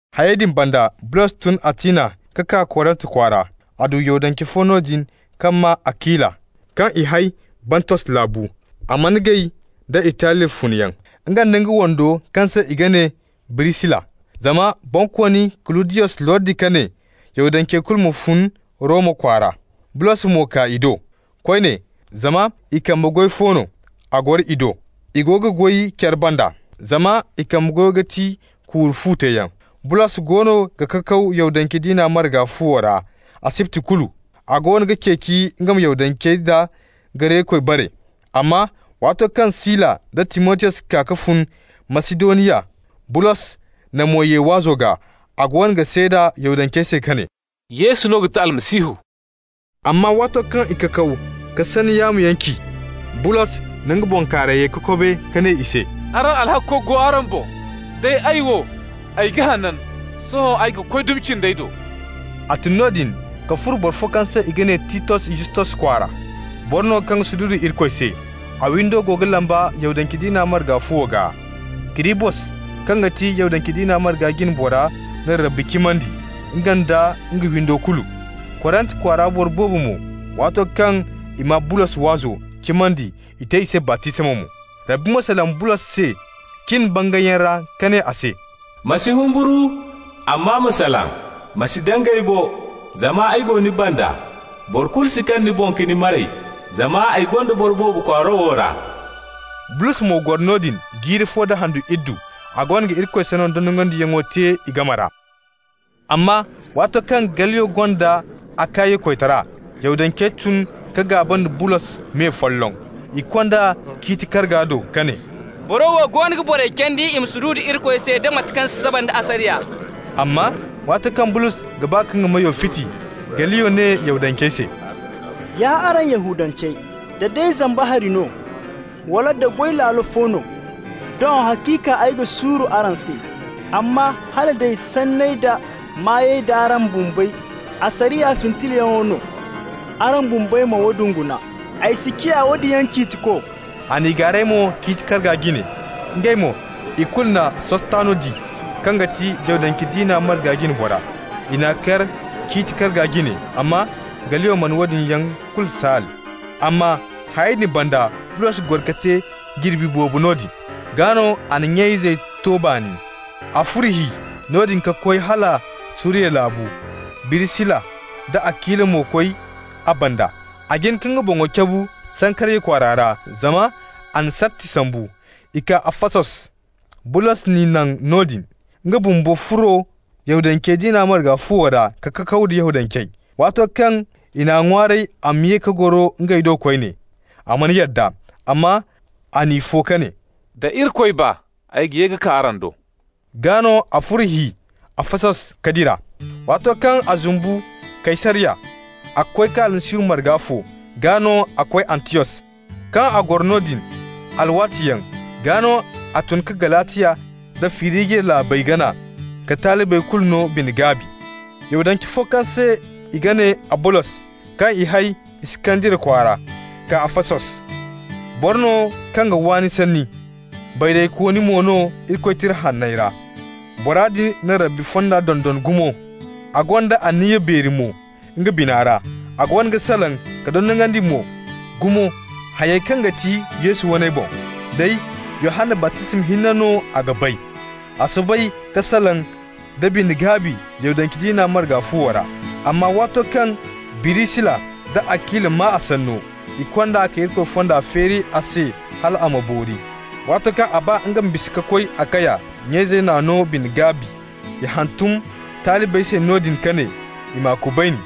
Hayey din banda, Bulos tun Atina ka kaa Korint kwaara. A du Yahudance fo noodin kaŋ maa Akila, kaŋ i hay Bontos laabu. A mana gay da Italiya funyaŋ, nga nda nga wando kaŋ se i ga ne Birisila, zama Bonkooni Kuludiyos lordi ka ne Yahudancey kulu ma fun Roma kwaara. Bulos mo kaa i do. Koyne, zama i kambe goy fo no, a goro i do. I go ga goy care banda, zama i kambe goyo ga ti kuuru-fu teeyaŋ. Bulos goono ga kakaw Yahudance diina marga fuwo ra asibti kulu, a goono ga ceeci nga ma Yahudancey da Garekey bare. Amma waato kaŋ Sila nda Timotiyos kaa ka fun Masidoniya, Bulos na mo ye waazo gaa. A goono ga seeda Yahudancey se ka ne: «Yesu no ga ti Almasihu.» Amma waato kaŋ i kakaw ka sanni yaamoyaŋ ci, Bulos na nga bankaarayey kokobe ka ne i se: «Araŋ alhakko go araŋ boŋ, day ay wo, ay ga hanan! Sohõ kay ay ga koy dumi cindey do.» A tun noodin ka furo boro fo kaŋ se i ga ne Titos Yustos kwaara. Boro no kaŋ ga sududu Irikoy se. A windo go ga lamba Yahudance diina marga fuwo gaa. Kirisbos, kaŋ ga ti Yahudance diina marga jine bora na Rabbi cimandi, nga nda nga windo kulu. Korint kwaara boro boobo mo, waato kaŋ i maa Bulos waazo, cimandi, i te i se baptisma mo. Rabbi mo salaŋ Bulos se cin bangayyaŋ ra ka ne a se: «Ma si humburu, amma ma salaŋ, ma si dangay bo. Zama ay go ni banda. Boro kulu si kaŋ ni boŋ ka ni maray, zama ay gonda boro boobo kwaaro wo ra.» Bulos mo goro noodin jiiri fo da handu iddu. A goono ga Irikoy sanno dondonandiyaŋo te i game ra. Amma waato kaŋ Galliyo gonda Akaya koytara, Yahudancey tun ka gaaba nda Bulos me folloŋ. I kond'a ciiti karga do ka ne: «Boro wo goono ga borey candi i ma sududu Irikoy se da mate kaŋ si saba nda asariya.» Amma waato kaŋ Bulos ga ba ka nga meyo fiti, Galliyo ne Yahudancey se: «Ya araŋ Yahudancey, da day zamba hari no, wala da goy laalo fo no, doŋ haciika ay ga suuru araŋ se. Amma hala day sanney da maayey d'araŋ bumbey asariya fintalyaŋo no, araŋ bumbey ma woodin guna. Ay si ciya woodin yaŋ ciitiko.» A n'i gaaray mo ciiti karga jine. Ngey mo, ikulu na Sostano di, kaŋ ga ti Yahudance diina marga jine bora. I n'a kar ciiti karga jine, amma Galliyo mana woodin yaŋ kulu saal. Amma hayey din banda, Bulos goro ka te jirbi boobo noodin. Gaa no a na nya-izey to baani. A furo hi noodin ka koy hala Suriya laabu, Birisila nda Akila mo koy a banda. A jin ka nga boŋo cabu Sankariya kwaara ra, zama a na sarti sambu. I kaa Afasos. Bulos n'i naŋ noodin. Nga bumbo furo Yahudance diina marga fuwo ra ka kakaw da Yahudancey. Waato kaŋ i n'a ŋwaaray a ma ye ka goro ngey do koyne, a mana yadda. Amma a n'i fo ka ne: «Da Irikoy ba, ay ga ye ka kaa araŋ do.» Gaa no a furo hi Afasos ka dira. Waato kaŋ a zumbu Kaysariya, a koy ka Almasihu marga fo, gaa no a koy Antiyos. Kaŋ a goro noodin alwaatiyaŋ, gaa no a tun ka Galatiya nda Firijiya laabey gana ka talibey kulu no bine-gaabi. Yahudance fo kaŋ se i ga ne Abolos, kaŋ i hay Iskandariya kwaara, kaa Afasos. Boro no kaŋ ga waani sanni, bayraykooni mo no Irikoy Tira Hanney ra. Bora din na Rabbi fonda dondon gumo. A gonda anniya beeri mo nga bina ra. A goono ga salaŋ ka dondonandi mo gumo hayey kaŋ ga ti Yesu waney boŋ. Day Yohanna baptisma hinne no a ga bay. A soobay ka salaŋ da bine-gaabi Yahudance diina marga fuwo ra. Amma waato kaŋ Birisila nda Akila maa a sanno, i kond'a ka Irikoy fonda feeri a se hal a ma boori. Waato kaŋ a ba nga ma bisa ka koy Akaya, nya-izey n'a no bine-gaabi. I hantum talibey se noodin ka ne i m'a kubayni.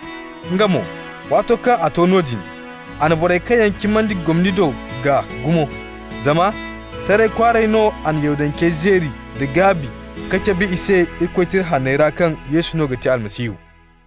Nga mo, waato kaŋ a to noodin, a na borey kaŋ yaŋ cimandi gomni do gaa gumo. Zama taray kwaaray no a na Yahudancey zeeri nda gaabi ka cabe i se Irikoy Tira Hanney ra kaŋ Yesu no ga ti Almasihu.